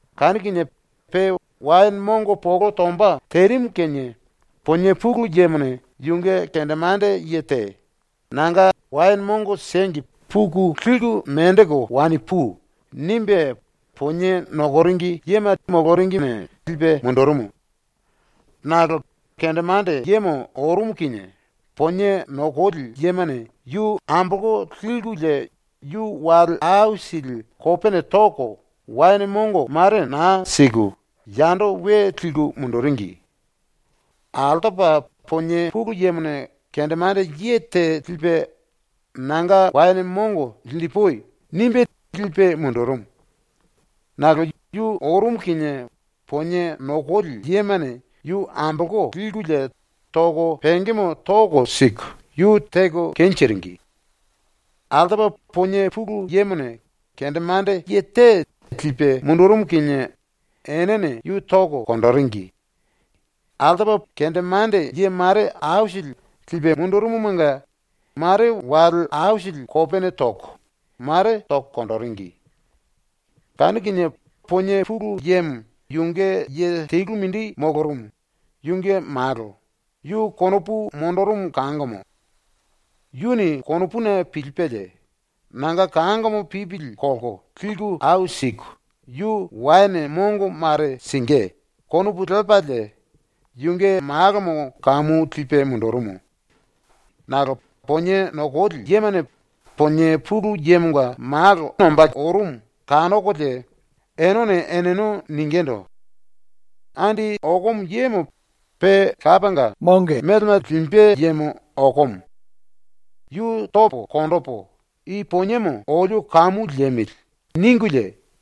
Kanu kinie pe waene mongo polo tomba terimu kinie ponie pulu yemone yunge kendemande ye te “Nanga waene mongo siengi puku liku menjiku wani pui.” nimbe ponie nokoringi yema moloringine lipe mundurumu. Nakolo kendemande yemo ⸤orumu kinie⸥ ponie nokoli yemane yu ambolko likulie yu wale aisili kopene toko waene mongo mare naa siku yando we liku munduringi. Altopa ponie pulu yemone kendemande ye te lipe ⸤“Nanga waene mongo linjipui.” nimbe lipe⸥ mundurumu. Nakolo yu ⸤orumu kinie⸥ ponie nokoli yemane yu ambolko likulie toko pengemo toko siku yu teko kenjiringi. Altopa ponie pulu yemone kendemande ye te lipe mundurumu kinie enene yu toko konjiringi. Kendemande ye mare aisili mele lipe mundurumumanga mare wale aisili kopene toko, mare toko konjiringi. Kanu kinie ponie pulu yemo yunge ye telu mindi molorumu, yunge malo, yu konopu monjirimu kangomo. Yuni ⸤konopuni pilipelie⸥ ‘Nanga kangomo pipili kolko liku ai siku, yu waene mongo mare singí.’ konopu lepalie yunge malomo kamu lipe mundurumu. Nakolo ponie nokoli yemane ponie pulu yemonga malo ombá orumu kanokolie enene eneno ningindu: “Andi okomo yemo pe lapanga melema limbe yemo okomo. Yu topo konjipu i poniemo olio kamu liemili.” ningulie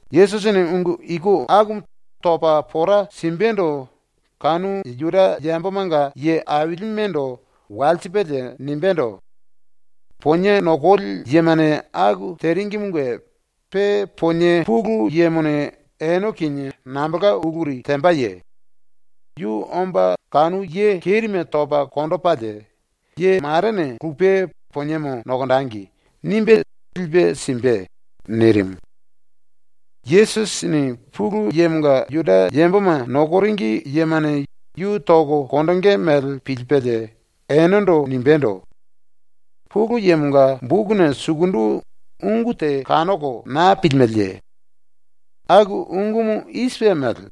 ⸤Yesusini ungu iku akumu topa pora simbendo kanu Juda yambomanga ye ailimendo walsipelie nimbendo:⸥ “Ponie nokoli yemane aku teringimunge pe ponie pulu yemone ene kinie nambolka uluri tembaye? Yu omba kanu ye kerime topa konjipelie ‘Ye marene lupe poniemo nokonjengi.’ nimbe lipe simbe.” ⸤nirimu.⸥ ⸤Yesusini Pulu Yemonga Juda yamboma nokoringi yemane yu toko konjingí mele pilipelie enendo nimbendo:⸥ “Pulu Yemonga bokuna sukundu ungu te kanoko naa pilimeleye? ⸤Aku ungumu i sipe mele:⸥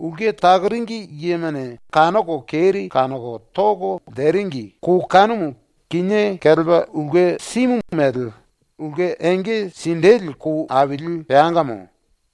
‘Ulke takoringi yemane kanoko keri kanoko toko ele teringi kou kanumu kinié kelepa ulke simu mele ulke enge sinjili kou aili peangamo.’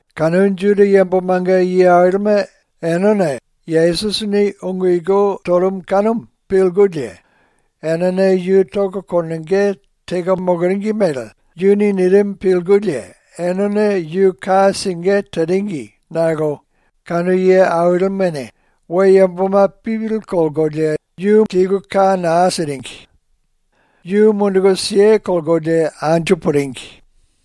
⸤Kanu Juda yambomanga ye ailime⸥ enene Yesusini ungu iku torumu kanumu pilkulie enene yu tonge teko moloringi mele yuni nirimu pilkulie enene yu ka singí teringi nakolo kanu ye ailimene we yamboma pipili kolkolie yu liku ka naa siringi. Yu munduku kelkolie anju puringi.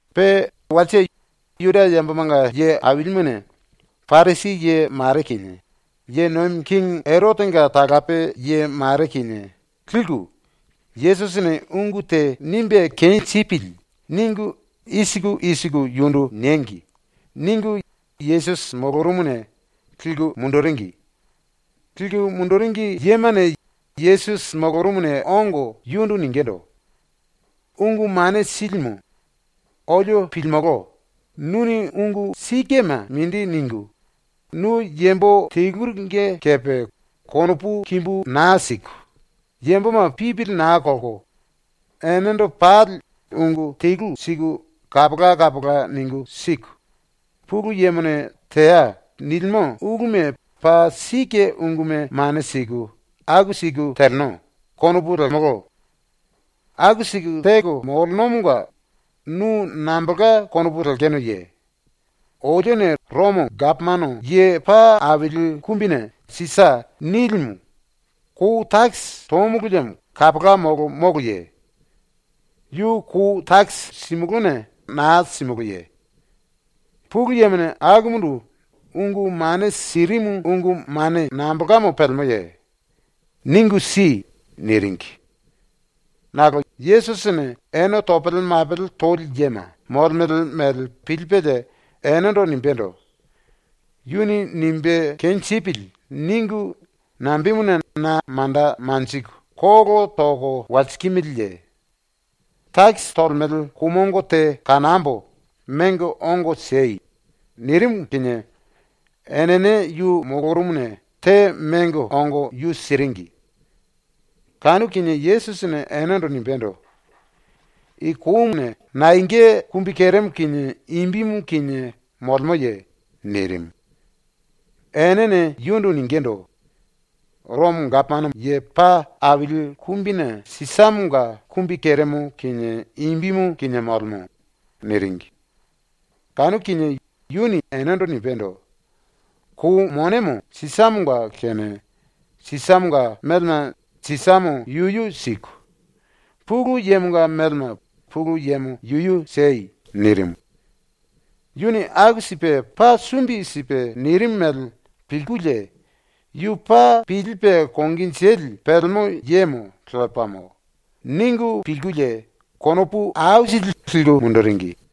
Pe walse ⸤Juda yambomanga ye ailimene⸥ Parisi ye mare kinie ye nomi kingi Erotenga talape ye mare kinie liku, “‘Yesusini ungu te nimbe kenjipili.’ ningu i siku i siku yundu niengi.” ningu Yesusi molorumuna liku munduringi. Liku munduringi yemane Yesusi molorumuna ongo yundu ningindu: “Ungu Mane Silimu, olio pilimolo, ‘nuni ungu sikema mindi ningu, nu yambo teluringe kepe konopu kimbu naa siku, yamboma pipili naa kolko enendo pali ungu telu siku kapola kapola ningu siku, Pulu Yemone “Teai.” nilimo uluma paa sike unguma mane siku, aku siku teleno.’ konopu lemolo. ⸤Aku siku teko molenomonga nu nambolka konopu lekenoye?⸥ Olione Romo Gapomano Ye Paa Aili Kumbine ‘Sisa’ nilimu kou takisi tomulu liemo kapola molo moloye? Yu ⸤kou takisi⸥ simulúne naa simulúne? Pulu Yemone akumundu ungu mane sirimu ungu mane nambolkamo pelemoye? Ningu si.” niringi. Nakolo Yesusini, ene topele mapele toli yema molemele mele pilipelie enendo nimbendo: “‘Yuni nimbe kenjipili.’ ningu nambemuna na manda manjiku kolo toko walsikimiliye? ⸤Takisi tolemele⸥ kou mongo te kanambo, mengo ongo siei.” nirimu kinie enene yu molorumuna te mengo ongo yu siringi. Kanu kinie Yesusini enendo nimbendo: “I kouna naenga kumbikeremo kinie imbimu kinie molemoye?” nirimu. Enene yundu ningindu: “Romo Gapomano Ye Paa Aili Kumbine Sisamonga kumbikeremo kinie imbimu kinie molemo.” niringi. Kanu kinie yuni enendo nimbendo: “⸤Kou monemo Sisamonga⸥ kene Sisamonga melema Sisamo yuyu siku, Pulu Yemonga melema Pulu Yemo yuyu siei.” nirimu. Yuni aku sipe ⸤paa sumbi sipe⸥ nirimu mele pilkulie ⸤‘Yu paa pilipe konginjili pelemo yemo lepamo.’ ningu pilkulie⸥ konopu aisili liku munduringi.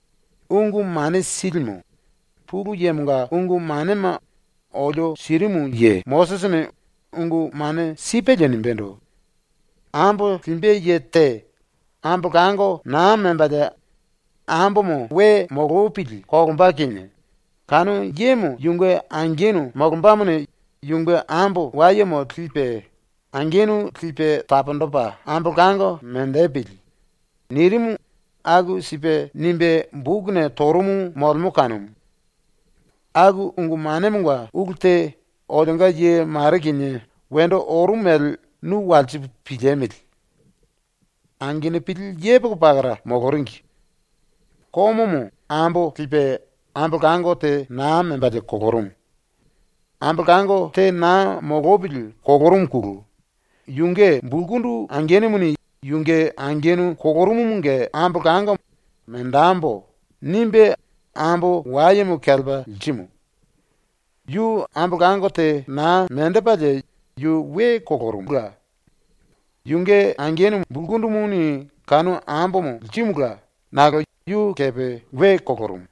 “Ungu Mane Silimu, ⸤Pulu Yemonga ungu manema olio sirimu ye⸥ Mosisini ungu mane sipelie nimbendo: “Ambo limbe ye te ambolango naa membalie ambomo we molopili kolomba kinie kanu yemo yunge angenu molombamone yunge ambo wayemo lipe angenu lipe taponjipe ambolango menjipili.” nirimu aku sipe nimbe bokuna torumu molemo kanumu. ⸤Aku ungu manemonga ulu te olionga ye mare kinie wendo orumu mele nu walsipu piliemili.⸥ “Angenupili yepoko pakara moloringi. Komomo ambo lipe ambolango te naa membalie kolorumu. ⸤Ambolango te naa molopili kolorumuna⸥ yunge bulkundu angenumuni ⸤yunge angenu kolorumumunge ambolango ‘Menjembo.’ nimbe⸥ ambo wayemo kelepa lirimu. Yu ambolango te naa menjipelie yu we kolorumula. Yunge angenu bulkundumuni kanu ambomo lirimula nakolo yu kepe we kolorumu.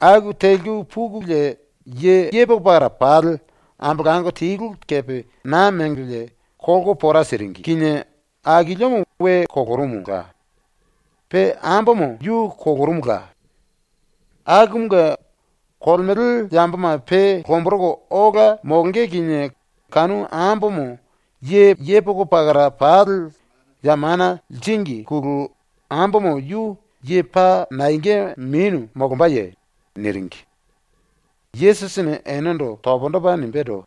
Aku teliku pukulie ye yepoko pakara pali ambolango telu kepe naa mengolie kolko pora siringi kinie akiliomo we kolorumula. Pe ambomo yu kolorumula. Akumunge, kolemele yamboma pe lomboroko ola molonge kinie kanu ambomo ye yepoko pakara pali ya mana liringine ambomo yu ye paa naenga menu molombaye?” niringi. Yesusini enendo pundu topa nimbendo: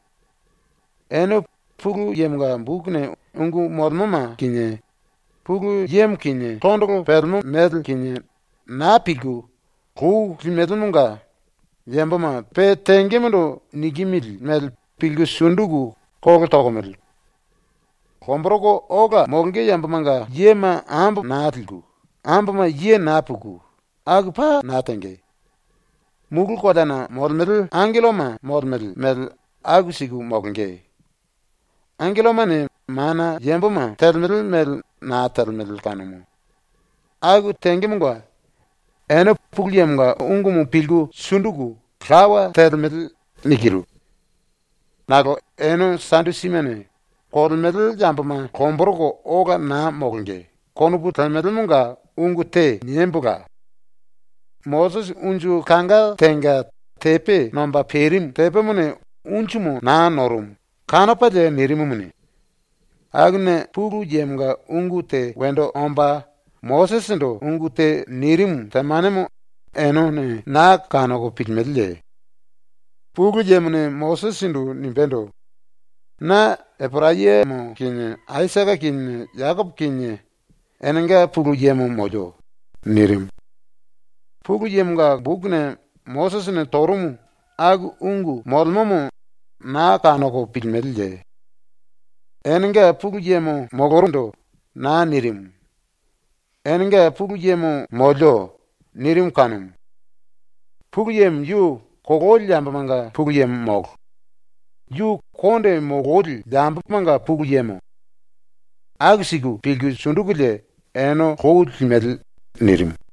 “Ene Pulu Yemonga bokuna ungu molemoma kinie, Pulu Yemo kinie tondolo pelemo mele kinie, naa pilku lou lemelemonga ⸤yamboma pe tengemondo nikimili mele pilku sunduku kolo tokomele⸥. Lomboroko ola molonge yambomanga yema ambo naa liku, amboma ye naa puku, aku paa naa tenge. Mulu koleana molemele angelloma molemele mele aku siku molonge. ⸤Angellomane mana yamboma telemele mele naa telemele kanumu.⸥ Aku tengemonga ⸤‘Ene Pulu Yemonga ungumu pilku sunduku lawa telemele.’ nikiru⸥. “Nakolo ⸤ene Sadusimene⸥ ‘Kolemele yamboma lomboroko ola naa molonge.’ konopu lemelemonga ungu te niembola. Mosisi unju kanga tenga ⸤tepe nomba perimu tepemone unjumu naa norumu kanopalie nirimumuni⸥ akuna Pulu Yemonga ungu te wendo omba Mosisindu ungu te nirimu temanemo enene naa kanoko pilimeleye? Pulu Yemone Mosisindu nimbendo: “Na Eporayamo kinie Aisake kinie Jekopo kinie enenga Pulu Yemo molio.” nirimu. Pulu Yemonga bokuna Mosisini torumu aku ungu molemomo naa kanoko pilimeleye? ⸤‘Enenga Pulu Yemo molorundu.’ naa nirimu. ‘Enenga Pulu Yemo molio.’ nirimu kanumu.⸥ Pulu Yemo yu kololi yambomanga Pulu Yemo molo; yu yambo kondemanga Pulu Yemo. Aku siku pilku sundukulie ene lou lemele.” nirimu.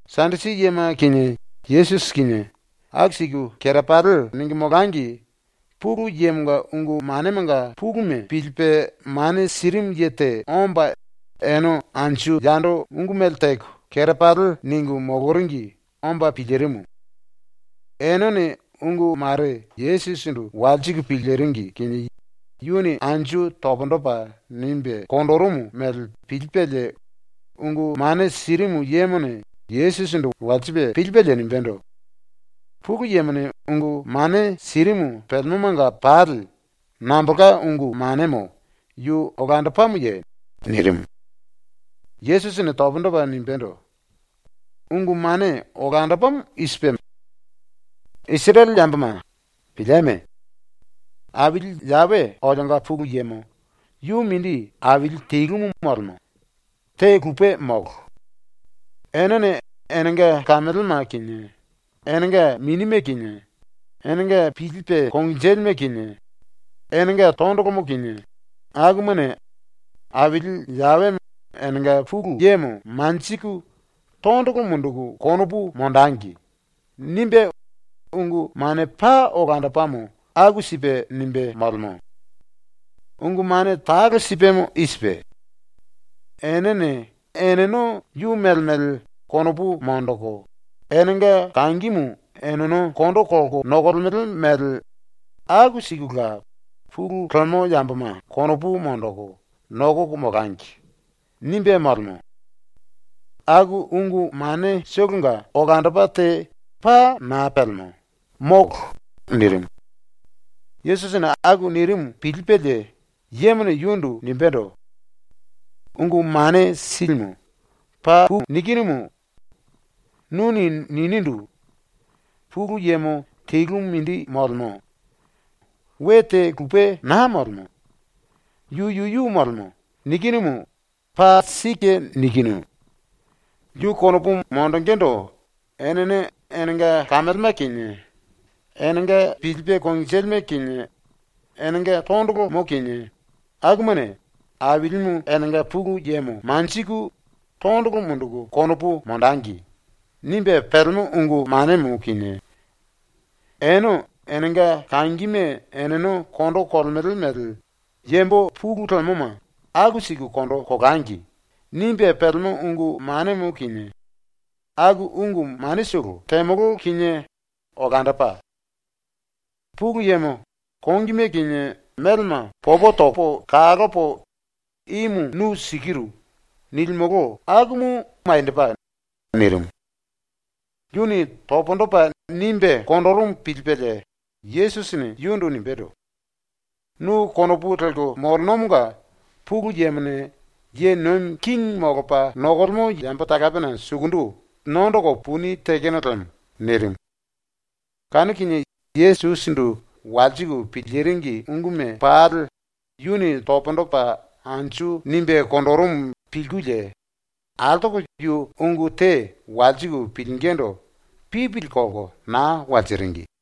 ⸤Sadusi yema kinie Yesusi kinie⸥ aku siku kerepali ningu molangi Pulu Yemonga ungu manemanga puluma pilipe mane sirimu ye te omba ene anju yando ungu mele teko kerepali ningu moloringi omba pilirimu. Enene ungu mare Yesusindu walsiku piliringi kinie yuni anju pundu topa nimbe konjirimu mele pilipelie ungu mane sirimu yemone Yesusindu walsipe pilipelie nimbendo: “Pulu Yemone ungu mane sirimu pelemomanga pali nambolka ungu manemo yu olandopamoye?” nirimu. Yesusini pundu topa nimbendo: “Ungu mane olandopamo i sipe: ‘Isirele yamboma, pilieme! Aili Yawe olionga Pulu Yemo yu mindi Aili telumu molemo, te lupe molo. Enene enenga kamelema kinie, enenga minime kinie, enenga pilipe konginjilime kinie, enenga tondolomo kinie, akumane Aili Yawe enenga Pulu Yemo manjiku tondolo munduku konopu monjengi.’ nimbe, ungu mane paa olandopamo aku sipe ⸤nimbe⸥ molemo. Ungu mane talo sipemo i sipe: ‘Enene eneno yu mele mele konopu monjiku enenga kangimu eneno kondo kolko nokolemele mele aku sikula pulu lemo yamboma konopu monjiku nokoko molangi.’ nimbe molemo. Aku ungu manetolonga olandopa te paa naa pelemo, molo.” nirimu. ⸤Yesusini aku nirimu pilipelie⸥ yemone yundu nimbendo: “Ungu Mane Silimu, papu nikinumu. Nuni ninindu: “Pulu Yemo telumu mindi molemo. We te lupe naa molemo. Yu yuyu molemo.” nikinumu paa sike nikinu. ‘Yu konopu monjingíndu enene enenga kamelema kinie, enenga pilipe konginjilime kinie, enenga tondolomo kinie, akumane ⸤Ailimu enenga Pulu Yemo⸥ manjiku tondolo munduku konopu monjengi.’ nimbe pelemo ungu manemo kinie ‘Ene enenga kangime eneno kondo kolemele mele yambo pulu lemoma aku siku kondo kolangi.’ nimbe pelemo ungu manemo kinie, aku ungu manetolo temolo kinie olandopa; Pulu Yemo kongime kinie melema popo topo kalopo “Imu nu sikiru.” nilimolo akumu maniendopa.” nirimu. Yuni pundu topa nimbe konjirimu pilipelie Yesusini yundu nimbendo: “Nu konopu lelko molenomonga Pulu Yemone ye nomi kingi molopa nokolemo yambo talapena sukundu nondoko puni tekeno lemo.” nirimu. Kanu kinie ⸤Yesusindu walsiku piliringi unguma pali yuni pundu topa anju nimbe konjirimu pilkulie⸥ altoko yu ungu te walsiku pilingindu pipili kolko naa walsiringi.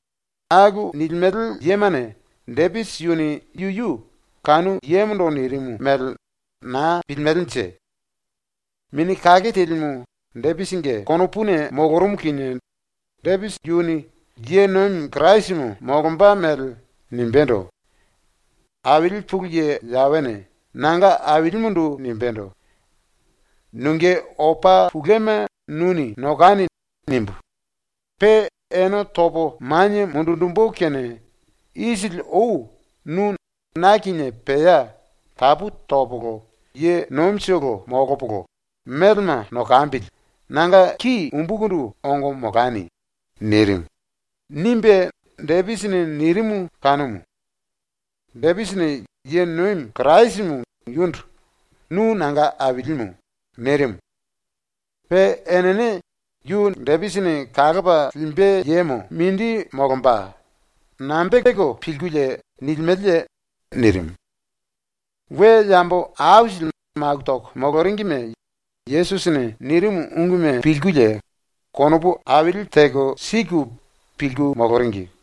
⸤Aku nilimele yemane⸥ Depisi yuni yuyu ⸤kanu yemondo nirimu mele naa pilimelenje.⸥ Mini Kake Telimu Depisinge konopuna molorumu kinie Depisi yuni ⸤ye Kirasimu molomba mele⸥ nimbendo: “Aili ⸤Pulu Ye Yawene⸥ nanga Ailimundu nimbendo: “‘Nunge opa touma nuni nokani.’ nimbu, pe ene topo manie mundunjimbu kene isili ou nu ⸤na kinie pea tapu topolo ye nomitolo molopolo melema nokambili⸥ nanga ki umbukundu ongo molani.” nirimu.” nimbe Depisini nirimu kanumu. Depisini ⸤ye nomi Kirasimu⸥ yundu “Nu nanga Ailimu.” nirimu. Pe enene “Yu Depisini kalopa limbe yemo ⸤mindi⸥ molomba.” nambe teko pilkulie nilimeleye?” nirimu. We yambo aisili maku toko moloringime Yesusini nirimu unguma pilkulie konopu aili teko siku pilku moloringi.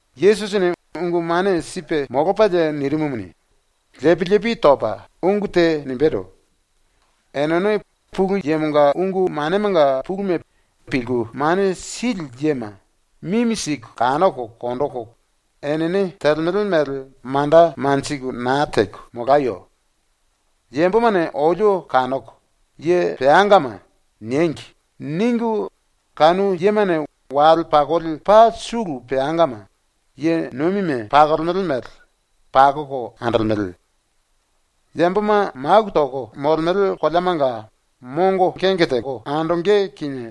Yesusini ungu mane sipe molopalie nirimumuni ⸤lepi lepi topa⸥ ungu te nimbendo: “Enene Pulu Yemonga ungu manemanga puluma pilku mane sili yema mimi siku kanoko konjiku ⸤enene telemele mele manda lelko naa teko⸥ molayo. ⸤‘Yambomane olio kanoko “Ye peangama” niengi.’ ningu⸥ kanu yemane wale pakoli paa sulu peangama, ⸤ye nomime pakolemele mele,⸥ pakoko andolemele. Yamboma maku toko molemele koleamanga mongo kenge teko andonge kinie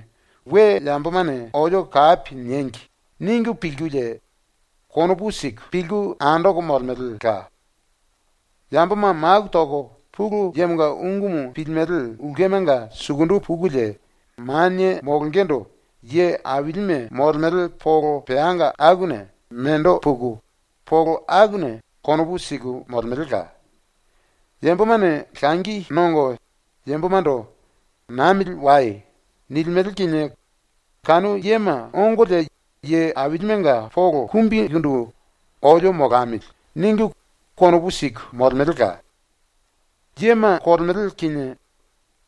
‘We yambomane olio kapi niengi.’ ningu pilkulie konopu siku pilku andoko molemelela. Yamboma maku toko Pulu Yemonga ungumu pilimele ulkemanga sukundu pukulie manie molongendo ye ailime molemele polo peanga akuna mendo puku polo akuna konopu siku molemelela. Yambomane langi nongo yambomando “Namili wai.” nilimele kinie kanu yema ongolie ye ailimenga polo kumbikundu ‘olio molamili.’ ningu konopu siku molemelela. “Yema kolemele kinie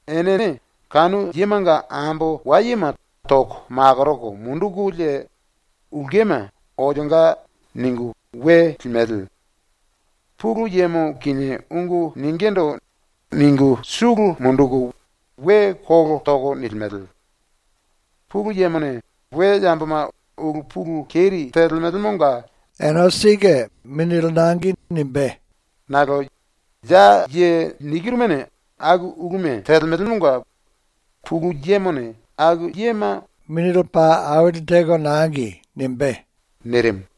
enene kanu yemanga ambo wayema toko makoroko mundukulie ulkema ‘Olionga’ ningu we limele. Pulu Yemo kinie ungu ningindu ningu sulu munduku we kolo toko nilimele. Pulu Yemone we yamboma ulu pulu keri telemelemonga ene sike mongo lipe simbe nakolo ya ye nikirumane aku uluma telemelemonga Pulu Yemone aku yema mongo aili tepa lipe simbe.” nirimu.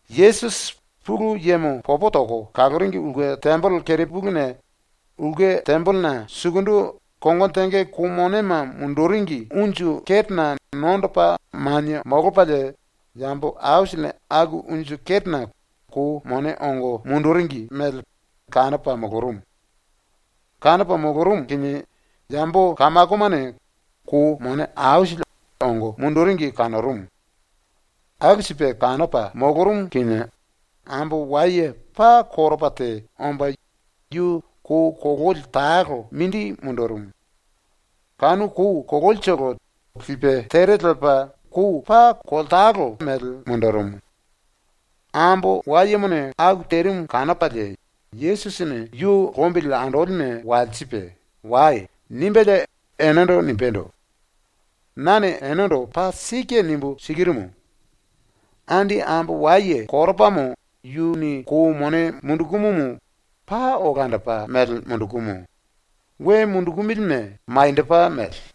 Yesusi ⸤Pulu Yemo popo toko kaloringi ulke tembele⸥ kerepuluna ulke tembelena sukundu kongono tenge kou monema munduringi unju ketena nondopa manie molopalie yambo aisilini aku unju ketena kou mone ongo munduringi mele kanopa molorumu. Kanopa molorumu kinie yambo kamakomane kou mone aisili ongo munduringi kanorumu. ⸤Aku sipe kanopa molorumu kinie⸥ ambo waye paa koropa te omba yu kou kololi talo mindi mundurumu. Kanu kou kololitolo lipe tere lepa wane toya mele mundurumu. ⸤Ambo wayemone aku terimu kanopalie⸥ Yesusini yu lombili andolime walsipe “Wai.” nimbelie enendo nimbendo: “Nane enendo paa sike nimbu sikirumu: Andi ambo waye koropamo yuni kou mone mundukumumu paa olandopa mele mundukumu, we mundukumilime maniendopa mele.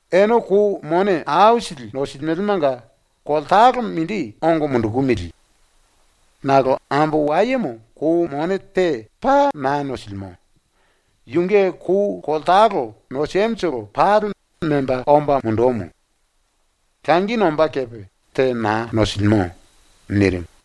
Ene kou mone aisili nosilimelemanga layetolo mindi ongo mundukumili. Nakolo ambo wayemo kou mone te paa naa nosilimo. Yunge kou layetolo nosimutolo pali memba omba mundumu. Langi nombá kepe te naa nosilimo.” nirimu.